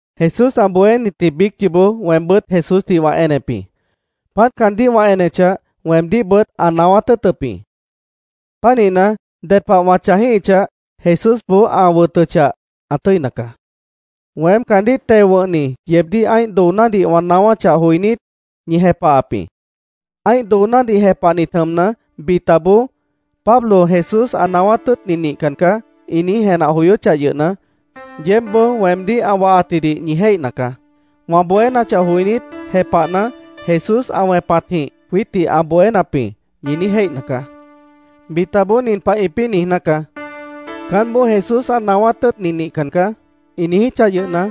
Jesús ã bohénitji biíc yoobó weembʉ́t Jesúsdih wã enep jĩ. Páant caandíh wã enechah, weemdíhbʉt ã naáwát tʉ́ʉtʉp jĩ. Pánihna, ded pah wã chãjíhichah, Jesúsboó ã wʉtʉchah, ã tʉ́ina caá. Weém caandíh teo wʉ̃hni yeebdíh ã́ih doonádih wã naáwáchah joinít, ñi jepahap jĩ. Ã́ih doonádih jepahnit jʉmna, bitaboó “Pablo Jesús ã naáwát tʉ́ʉtni nihcan caá”, ĩ niíj jenah joyóchah yʉhna, yeébboó weemdíh ã wahatjidih ñi jéihna caá. Wã bohénachah joinít, jepahna, “Jesús ã wẽpatjĩh jwiítdih ã bohénap jĩ”, ñi niíj jéihna caá. Bitaboó nin pah ĩpĩ́ niijná caá: “Caánboó Jesús ã naáwát tʉ́ʉtni nihcan caá”, ĩ niijíchah yʉhna,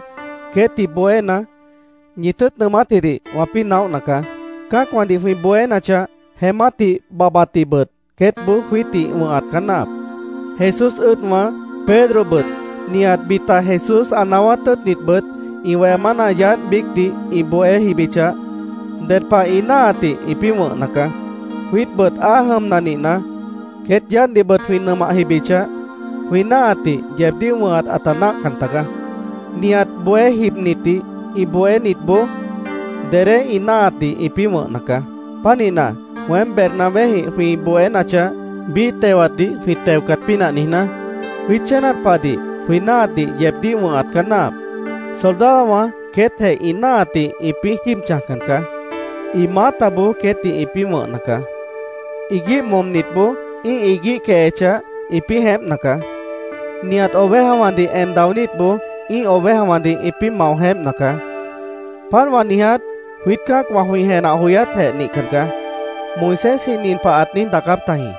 queétdih bohéna, ñi tʉ́ʉt nʉʉmátjidih wãpĩ́ naóhna caá. Cã́acwãdih jwĩ bohénachah, jeémátdih babhbatdihbʉt queétboó jwiítdih wʉ̃hat caá náahap. Jesús ʉ́ʉdwã, Pedrobʉt, nihat bita Jesús ã naáwát tʉ́ʉtnitbʉt ĩ weha mána yaádh biícdih ĩ bohé jibichah, ded pah ĩ náahatdih ĩpĩ́ wʉ̃hna caá. Jwiítbʉt áa jʉmna nihna, queét yaádhdihbʉt jwĩ nʉmah jibichah, jwĩ náahatdih yeebdíh wʉ̃hat ãta náahcan tagaá. Nihat bohé jibnitdih ĩ bohénitboó dedé ĩ náahatdih ĩpĩ́ wʉ̃hna caá. Pánihna, weém Bernabéjĩh jwĩ bohénachah, biíh tewatdih jwĩ teocat pínah niijná, jwiít chénat pahdih jwĩ náahatdih yeebdíh wʉ̃hat caá náahap. Soldadowã queétjeh ĩ náahatdih ĩpĩ́ jíib chãjcan caá. Ĩ maátaboó queétdih ĩpĩ́ wʉ̃hna caá. Iguíh momnitboó ĩ́ih iguíh quehechah, ĩpĩ́ jeémpna caá. Nihat ovejawãdih en daonítboó ĩ́ih ovejawãdih ĩpĩ́ mao jeémpna caá. Páant wã niiját jwiít cã́acwã jwĩ jenah joyátjeh nihcan caá. Moisésji nin pah ãt niíj daacáp tajĩ: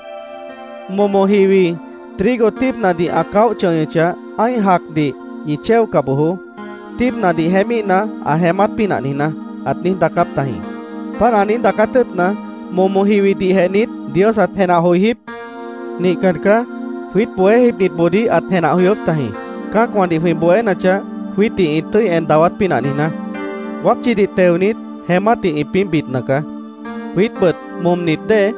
“Momo jiwi trigo tíibnadih ã caóh chʉñʉchah, ã́ih jacdih ñi chéoca bojoó, tíibnadih jeémíhna, ã jeémát pínah niijná”, ãt niíj daacáp tajĩ. ¿Páant ã niíj daacát tʉ́ʉtna, momo jiwidihjeh niít Dios ãt jenah joijíp? Nihcan caá. Jwiít bohé jibnitboodíh ãt jenah joyóp tajĩ, cã́acwãdih jwĩ bohénachah, jwiítdih ĩ tʉ́i en dawát pínah niijná. Wápchidih teonit, jeémátdih ĩpĩ́ bidna caá. Jwiítbʉt momnit dée,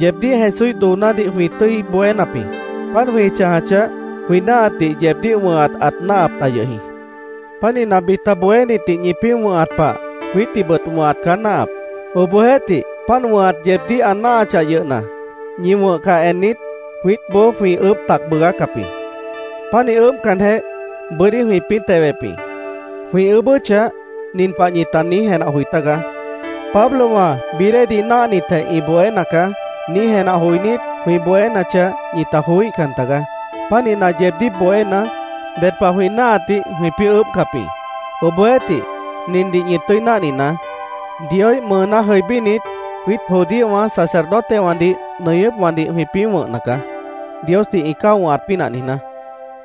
yeebdíh Jesúíh doonádih jwĩ tʉ́i bohénap jĩ. Páant jwĩ chãjachah, jwĩ náahatdih yeebdíh wʉ̃hat ãt náahap ta yʉh jĩ. Pánihna, bita bohénitdih ñipĩ́ wʉ̃hat pah, jwiítdihbʉt wʉ̃hat caá náahap. Obohjeéhtih, páant wʉ̃hat yeebdíh ã náahachah yʉhna, ñi wʉ̃hcah ennit, jwiítboó jwĩ ʉʉ́bh tac bʉʉgácap jĩ. Pánih ʉʉ́bhcanjeh, bʉ́dí jwĩpĩ́ tewep jĩ. Jwĩ ʉʉ́bʉ́chah, nin pah ñita niíj jenah joi tágaá: “Pablowã bií déedih náahnitjeh, ĩ bohéna caá”, niíj jenah joinít, jwĩ bohénachah, ñita joííhcan tagaá. Pánihna, yeebdíh bohéna, ded pah jwĩ náahatdih jwĩpĩ́ ʉʉ́bhcap jĩ. Obohjeéhtih, nindih ñi tʉ́i náhninaá: Dioíh mʉʉná jʉibínit, jwiít judíowã sacerdotewãdih nʉñʉ́pwãdih jwĩpĩ́ wʉ̃hna caá, Diosdih ĩ cáo wʉ̃hat pínah niijná.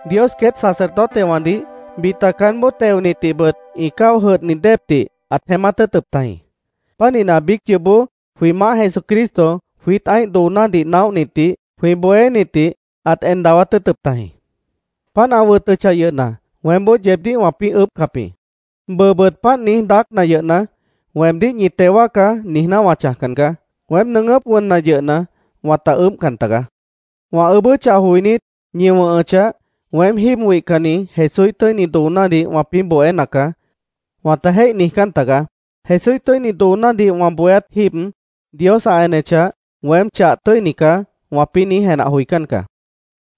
Dios queét sacerdotewãdih, bita caánboó teonitdihbʉt ĩ cáo jʉdhni déepdih ãt jeémát tʉ́ʉtʉp tajĩ. Pánihna, biíc yoobó jwĩ Maáh Jesucristo jwiít ã́ih doonádih naóhnitdih jwĩ bohénitdih ãt en dawát tʉ́ʉtʉp tajĩ. Páant ã wʉtʉchah yʉhna, weémboó yeebdíh wãpĩ́ ʉʉ́bhcap jĩ. Bʉʉbʉt páant niíj daácna yʉhna, “Weemdíh ñi teo wáacá”, niijná wã chãjcan caá. Weém nʉʉgʉ́p wʉnna yʉhna, wãta ʉʉ́bhcan tagaá. Wã ʉʉ́bʉ́chah joinít, ñi wʉ̃hʉchah, “Weém jíib wihcanni Jesúíh tʉ́ini doonádih wãpĩ́ bohéna caá”, wãta jéih niijcán tagaá. “Jesúíh tʉ́ini doonádih wã bohéát jíib, Dios ã enechah, weém chah tʉ́ini caá”, wãpĩ́ niíj jenah joicán caá.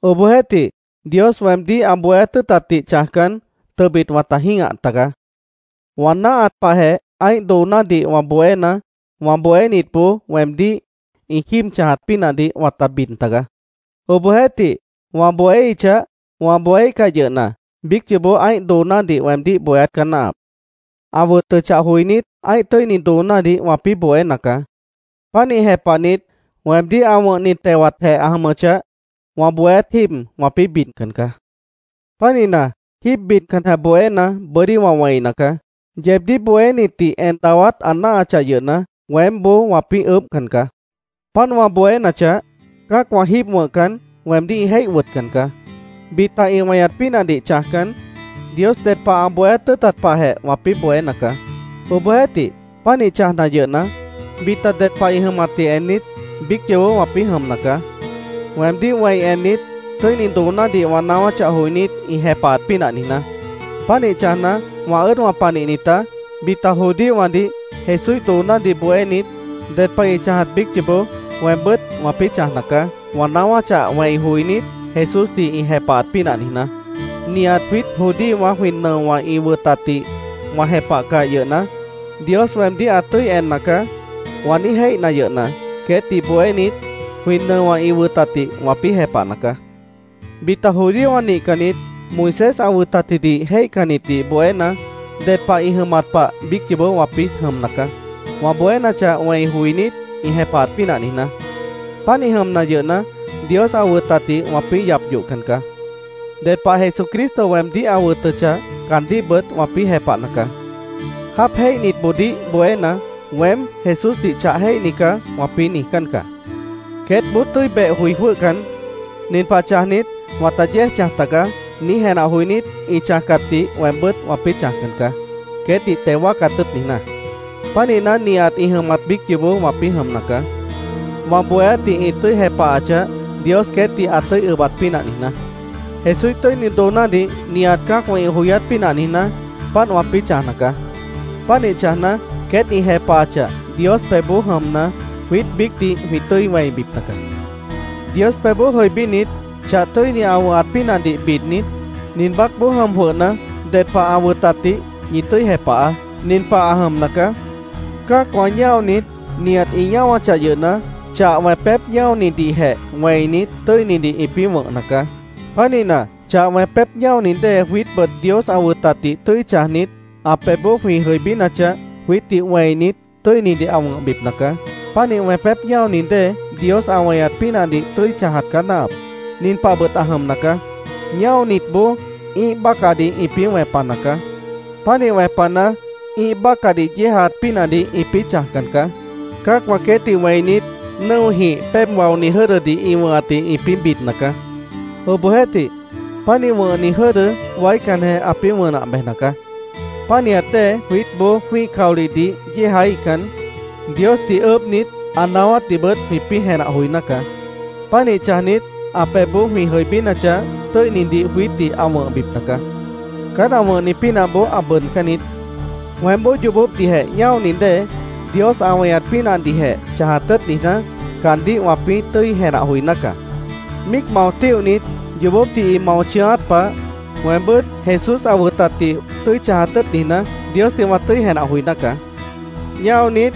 Obohjeéhtih, Dios weemdíh ã bohéát tʉ́ʉtatdih chãjcan, tʉbit wãta jĩ́gah tagaá. Wã náahat pahjeh ã́ih doonádih wã bohéna, wã bohénitboó weemdíh ĩ jíib chãjat pínahdih wãta bid tagaá. Obohjeéhtih, wã bohéíhichah, wã bohéíhcah yʉhna, biíc yoobó ã́ih doonádih weemdíh bohéát caá náahap. Ã wʉtʉchah joinít, ã́ih tʉ́ini doonádih wãpĩ́ bohéna caá. Pánih jepahnit, weemdíh ã wʉ̃hni tewatjeh ã jʉmʉchah, wã bohéát jíib wãpĩ́ bidcan caá. Pánihna, jíib bidcanjeh bohéna, bʉ́dí wã wẽina caá. Yeebdíh bohénitdih en dawát ã náahachah yʉhna, weémboó wãpĩ́ ʉʉ́bhcan caá. Páant wã bohénachah, cã́acwã jíib wʉ̃hcan, weemdíh ĩ jéih wʉtcan caá. Bita ĩ weñat pínahdih chãjcan, Dios ded pah ã bohéát tʉ́ʉtat pahjeh wãpĩ́ bohéna caá. Obohjeéhtih, pánih chãjna yʉhna, bita ded pah ĩ jʉmatdih ennit, biíc yoobó wãpĩ́ jʉmna caá, weemdíh wẽi ennit, tʉ́ini doonádih wã naáwáchah joinít, ĩ jepahat pínah niijná. Pánih chãjna, wã ʉ́ʉdwã panihnitá, bita judíowãdih Jesúíh doonádih bohénit, ded pah ĩ chãjat biíc yoobó weembʉ́t wãpĩ́ chãjna caá, wã naáwáchah wẽi joinít, Jesúsdih ĩ jepahat pínah niijná. “Nihat jwiít judíowã jwĩ nʉowã ĩ wʉtatdih wã jepahcah yʉhna, Dios weemdíh ã tʉ́i enna caá”, wã niíj jéihna yʉhna, queétdih bohénit, jwĩ nʉowã ĩ wʉtatdih wãpĩ́ jepahna caá. Bita judíowã nihcannit Moisés ã wʉtatjidih jéihcannitdih bohéna, ded pah ĩ jʉmat pah biíc yoobó wãpĩ́ jʉmna caá, wã bohénachah wẽi joinít, ĩ jepahat pínah niijná. Pánih jʉmna yʉhna, Dios ã wʉtatdih wãpĩ́ yap yohcan caá. Ded pah Jesucristo weemdíh ã wʉtʉchah, caandíhbʉt wãpĩ́ jepahna caá. Jáap jéihnitboodíh bohéna, “Weém Jesúsdih chah jéihni caá”, wãpĩ́ niijcán caá. Queétboó tʉ́i beh joi jwʉ́hcan, “Nin pah chãjnit, wãta yéej chãj tagaá”, niíj jenah joinít, ĩ chãjcatdih weembʉ́t wãpĩ́ chãjcan caá, queétdih teo wáacat tʉ́ʉt niijná. Pánihna, nihat ĩ jʉmat biíc yoobó wãpĩ́ jʉmna caá, wã bohéátdih ĩ tʉ́i jepahachah, Dios queétdih ã tʉ́i ʉbat pínah niijná. Jesúíh tʉ́ini doonádih nihat cã́acwã ĩ joyát pínah niijná, páant wãpĩ́ chãjna caá. Pánih chãjna, queét ĩ jepahachah, Dios pebhboó jʉmna, jwiít biícdih jwĩ tʉ́i wẽibipna caá. Dios pebhboó jʉibínit, chah tʉ́ini ã wʉ̃hat pínahdih bidnit, nin baácboó jʉm jwʉhna, ded pah ã wʉtatdih ñi tʉ́i jepahaá. Nin pah ã jʉmna caá: Cã́acwã ñáonit, nihat ĩ ñáwachah yʉhna, chah wẽpép ñáonidihjeh wẽinit, tʉ́inidih ĩpĩ́ wʉ̃hna caá. Pánihna, chah wẽpép ñáoni dée jwiítbʉt Dios ã wʉtatdih tʉ́i chãjnit, ã pebhboó jwĩ jʉibínachah, jwiítdih wẽinit, tʉ́inidih ã wʉ̃hbipna caá. Pánih wẽpép ñáoni dée, Dios ã weñat pínahdih tʉ́i chãjat caá náahap. Nin pahbʉt ã jʉmna caá: Ñáonitboó ĩ́ih bácahdih ĩpĩ́ wẽpana caá. Pánih wẽpana, ĩ́ih bácahdih yéejaat pínahdih ĩpĩ́ chãjcan caá. Cã́acwã queétdih wẽinit, nʉ́ojĩh péeb waoni jʉ́dʉdih ĩ wʉ̃hatdih ĩpĩ́ bidna caá. Obohjeéhtih, pánih wʉ̃hni jʉ́dʉ waícanjeh ãpĩ́ wʉnah bejna caá. Pánihat dée jwiítboó jwĩ́ih caolihdih yéejaíhcan, Diosdih ʉʉ́bhnit, ã naáwátdihbʉt jwĩpĩ́ jenah joiná caá. Pánih chãjnit, ã pebhboó jwĩ jʉibínachah, tʉ́inidih jwiítdih ã wʉ̃hbipna caá. Caán ã wʉ̃hni pínahboó ã bʉʉdcán niít. Weémboó yoobópdihjeh ñáoni dée, Dios ã weñat pínahdihjeh chãjat tʉ́ʉt niijná, caandíh wãpĩ́ tʉ́i jenah joiná caá. Míic mao tíohnit yoobópdih ĩ mao chʉ̃ʉ́át pah, weembʉ́t Jesús ã wʉtatdih tʉ́i chãjat tʉ́ʉt niijná, Diosdih wã tʉ́i jenah joiná caá. Ñáonit,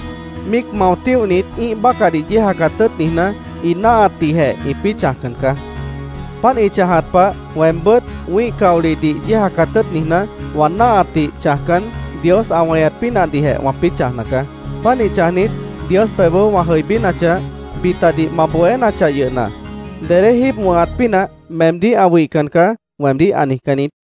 míic mao tíohnit ĩ́ih bácahdih yéejacat tʉ́ʉt niijná, ĩ náahatdihjeh ĩpĩ́ chãjcan caá. Páant ĩ chãjat pah, weembʉ́t wĩ́ih caolihdih yéejacat tʉ́ʉt niijná, wã náahatdih chãjcan, Dios ã weñat pínahdihjeh wãpĩ́ chãjna caá. Pánih chãjnit, Dios pebhboó wã jʉibínachah, “Bitadih ma bohénachah yʉhna, dedé jíib wʉ̃hat pínah meemdíh ã wihcan caá”, weemdíh ã niijcán niít.